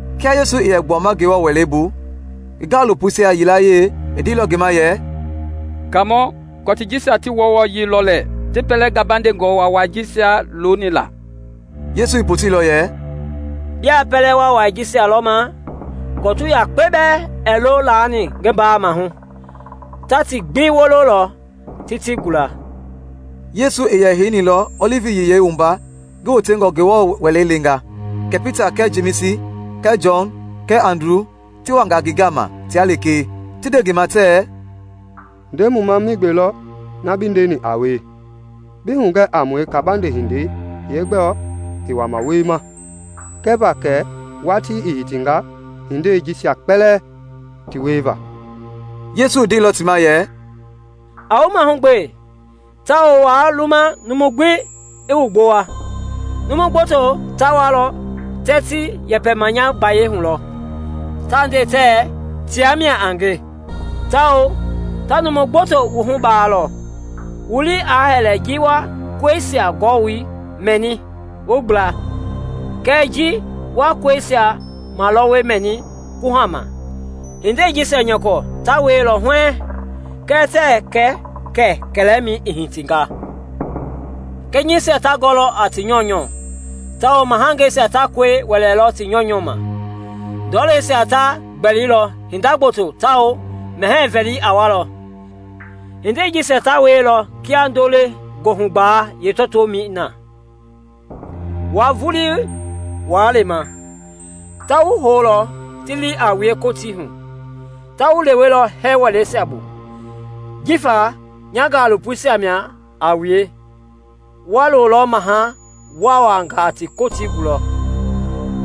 Kia Yesu i yɛ gbuama Ngewɔ Wɛlei bu, ngi gaalopoisia yilayee i ndeilɔ ngi ma yɛ, “Kaamɔ, kɔtii jisia ti wɔwɔyii lɔ lɛɛ ti pɛlɛ gabandengɔ waawai jisia loni la!” Yesu i poteilɔ yɛ, “Bia pɛlɛ waawai jisia lɔma? Kɔtu yakpe bɛɛ ɛɛ lo laani ngi mbaa mahu; ta ti gbi wololɔ ti ti gula.” Yesu i yɛ heinilɔ Ɔlivi Yiyei wumba ngi wotengɔ Ngewɔ Wɛlei leenga, kɛ Pita kɛɛ Jemisi kɛɛ Jɔn kɛɛ Andru ti wanga ngi gama tia lekee, ti nde ngi ma tɛɛ, “Nde mu ma migbe lɔ, na bi ndeni, a wie, bi hugɛ a mue kabande hindei yeegbɔɔ i wama wiema kɛva kɛ watii i hitinga hindei jisia kpɛlɛɛ ti wieva.” Yesu i ndeilɔ ti ma yɛ, “A wu mahugbe, tawao waa luma numu gbi i wu gbowa. Numu gboto ta walɔ tɛɛ ti yɛpɛma nya gbayei hu lɔ, ta nde tɛɛ, ‘Ta mia a nge’ tawao ta numu gboto wuhu baalɔ. Wu lii aa hɛlɛ ji wa kɔisia gɔwoi mɛni wu gbla kɛɛ ji wa kɔisia malɔwɔ mɛni kuhama. Hindei jisia nyɔkɔ ta wielɔ huɛɛŋ, kɛɛ tɛɛ kɛ kɛ kɛlɛmɛi i hitinga. Kɛnyɛisia ta gɔlɔ a ti nyɔunyɔ tawao mahangeisia ta kɔi wɛlɛlɔ ti nyɔunyɔ ma; ndɔleisia ta gbɛlilɔ hinda gboto tawao mɛhɛɛ vɛli a walɔ. Hindei jisia ta wielɔ kia ndo-le-goohugbalei yeetɔtoomɛi na. “Wua vulii waa lema. Ta wu houlɔ ti li a wue Kotii hu. Ta wu lewelɔ hɛɛ wɛleisia bu; jifa nya gaalopoisia a wue wa lolɔ maha waawangaa ti Kotii gulɔ.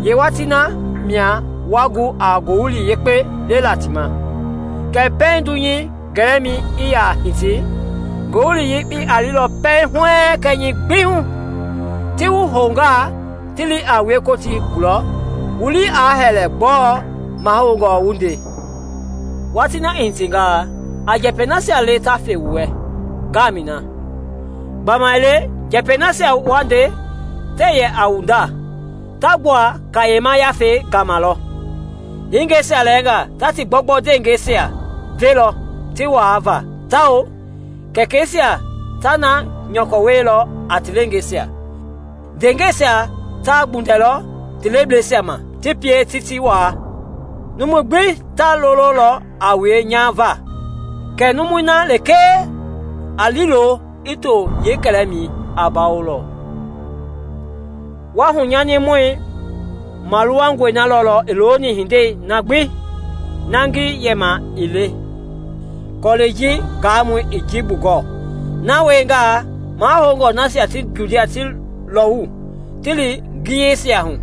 Yeewatii na mia wa gu a Ngowili Yekpei lela ti ma. Kɛɛ pɛiŋ dunyei gɛlɛmɛi i ya hiti, Ngowili Yekpei a le pɛiŋ huɛɛŋ kɛnyɛi gbi hu. Ti wu houngaa ti li a wue Kotii gulɔ, wu lii aa hɛlɛ gbɔɔ mahoungɔ wu nde; watii na i hitingaa, a njɛpɛi nasia le ta ve wu wɛ ngamɛi na. Gbamaile njɛpɛi nasia wa nde tɛɛ yɛ a wu nda, ta gbua Kayema Yafei gama lɔ. Hingeisia lɛɛngaa ta ti gbɔgbɔ ndeehingeisia velɔ ti waa va tawao kɛkɛisia ta na nyɔkɔ wielɔ a ti leengeisia. Ndeengɛisia ta gbundɛlɔ ti lebleisia ma ti pie ti ti waa. Numui gbi ta lololɔ a wue nya va, kɛɛ numui na lekee a liilo i to yeekɛlɛmɛi, a bawolɔ.” “Wa hunyanimɔ maluwangɔi lɔlɔ i looni hindei na ngi yɛma ii le (kɔlɛi ji gaamɔi i ji bugɔɔ.) Na wiengaa, mahoungɔ nasia ti Judia ti lɔwu ti li ngiyeisia hu.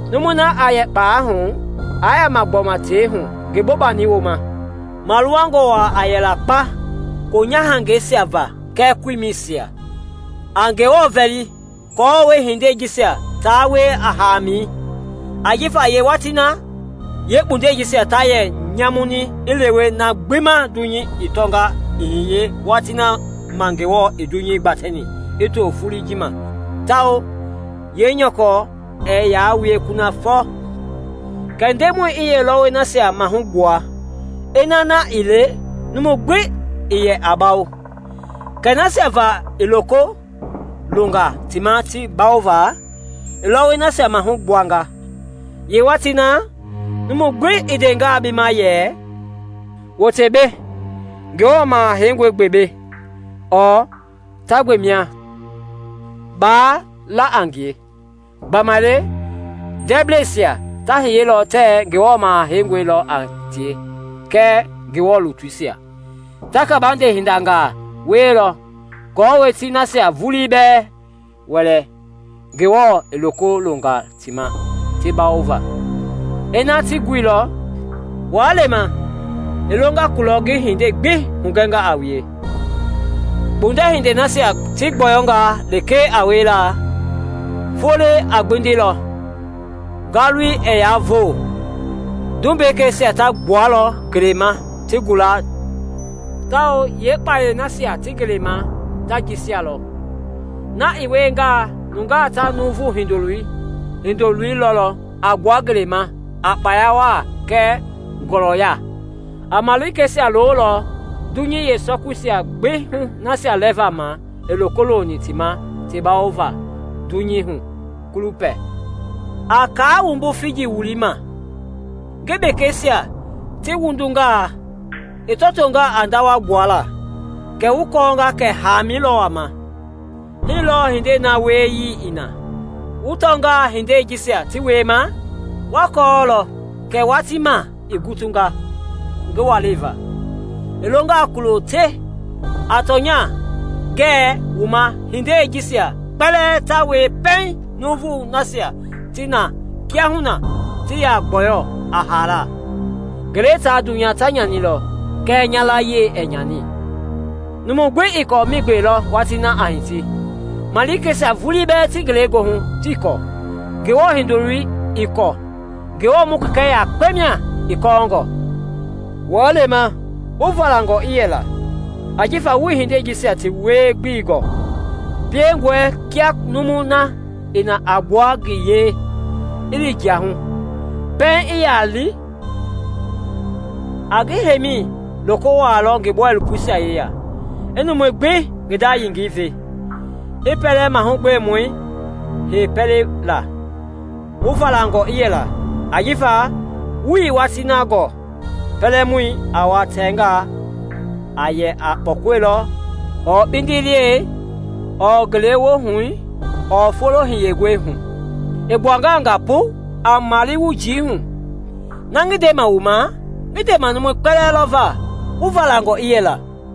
Numui na a yɛ kpalɛi hu, aa yama gbɔma tei hu ngi bobani wooma. Maluwangɔ a yɛla kpa koonyahangɛisia va kɛɛ koimɛisia! A Ngewɔ vɛli aako hindei jisia taa wie a hamɛi! Ajifa yeewatii na, yeekpundɛisia ta yɛ nyamuni i lewe na gbi ma dunyei i tɔnga i hiye watii na ma Ngewɔ i dunyei gbatɛni i to foloi ji ma tawao yeenyɔkɔ ɛɛ yaa wie kunafɔ. Kɛɛ Ndemɔi i yeelɔwɔi nasia mahu gbuanga; ina na ii le numu gbi ii yɛ bawo. Kɛɛ nasia va i loko longa ti ma ti bawova, i lɔwɔi nasia mahu gbuanga. Yeewatii na, numu gbi i ndengaa bi ma yɛ, ‘Wote mbei, Ngewɔ Maha Heingɔi gbe mbei!’ ɔɔ ‘Ta gbe mia!’ baa la a ngie. Gbamaile ndɛɛblɛisia ta hiyelɔ tɛɛ Ngewɔ Maha Heingɔi lɔ a tie kɛɛ Ngewɔ lutuisia. Ta kabande hindangaa wielɔ aako ti nasia vulii bɛɛ wɛlɛ Ngewɔ i loko longa ti ma ti bawova, ina ti guilɔ. Waa lema! I longa kulɔ ngi hindei gbi hugɛnga a wue.” “Kpundɛ hindei nasia ti gbɔyɔngaa lekee a wiela, foloi a gbindilɔ, ngalui ɛɛ yaa voo, tumbekeisia ta gbualɔ ngelei ma ti gula tawao yeekpayɛi nasia ti ngelei ma ta jɛsialɔ. Na i wiengaa, nungaa ta Nuuvu Hindoloi lɔlɔ a gbua ngelei ma a kpaya waa kɛɛ ngɔlɔya. A malikeisia lolɔ dunyei yeesɔkui gbi hu nasia lɛva ma i loko loni ti ma ti bawova dunyei hu kulupɛ.” “A kaa wumbu figi wulii ma. Ngi bekeisia ti wundungaa, i tɔtoo a ndawa gbuala, kɛ wu kɔɔnga kɛ haamɛi lɔ wama. Hii lɔɔ hindei na wieyii i na; wu tɔngaa hindei jisia ti wiema, wa kɔɔlɔ kɛ watii ma i gutunga ngi walei va, i longa kulo te. A tɔnya, ngɛ wu ma hindei jisia kpɛlɛɛ ta wie pɛiŋ nuuvui nasia ti na kiahuna ti ya gbɔyɔ a haala. Ngelei taa dunyei ta nyanilɔ kɛɛ nya layie ɛɛ nyani.” “Numu gbi ii kɔɔ migbe lɔ watii na a hiti, malikeisia vulii bɛɛ ti ngelegoohu tii kɔɔ; Ngewɔ Hindoloi ii kɔɔ, Ngewɔ mu Kɛkɛ yakpe mia i kɔɔngɔ. Waa lema, wu valangɔ i yɛla, ajifa wuii hindei jisia ti wie-gbelei gɔɔ. Piengɔe kia numui na i na a gbua ngi yee, i li jia hu. Pɛiŋ i ya li, a ngi heimi loko wualɔ ngi bɔilopoisia yeya, i numui gbi ngi nda yengei ve, i pɛlɛ mahugbemɔi hei pɛlei la. Wu valangɔ i yɛla, ajifa wuii watii na gɔɔ pɛlɛmɔi a wa tɛngaa a yɛ a kpɔkɔi lɔ ɔɔ kpindiliɛi ɔɔ ngewohui ɔɔ foloi hiyengɔi hu. I gbuangaa nga pu, aa male wu njii hu. Na ngi ndema wu ma, ngi ndema numui gbi lɔ va: wu valangɔ i yɛla!”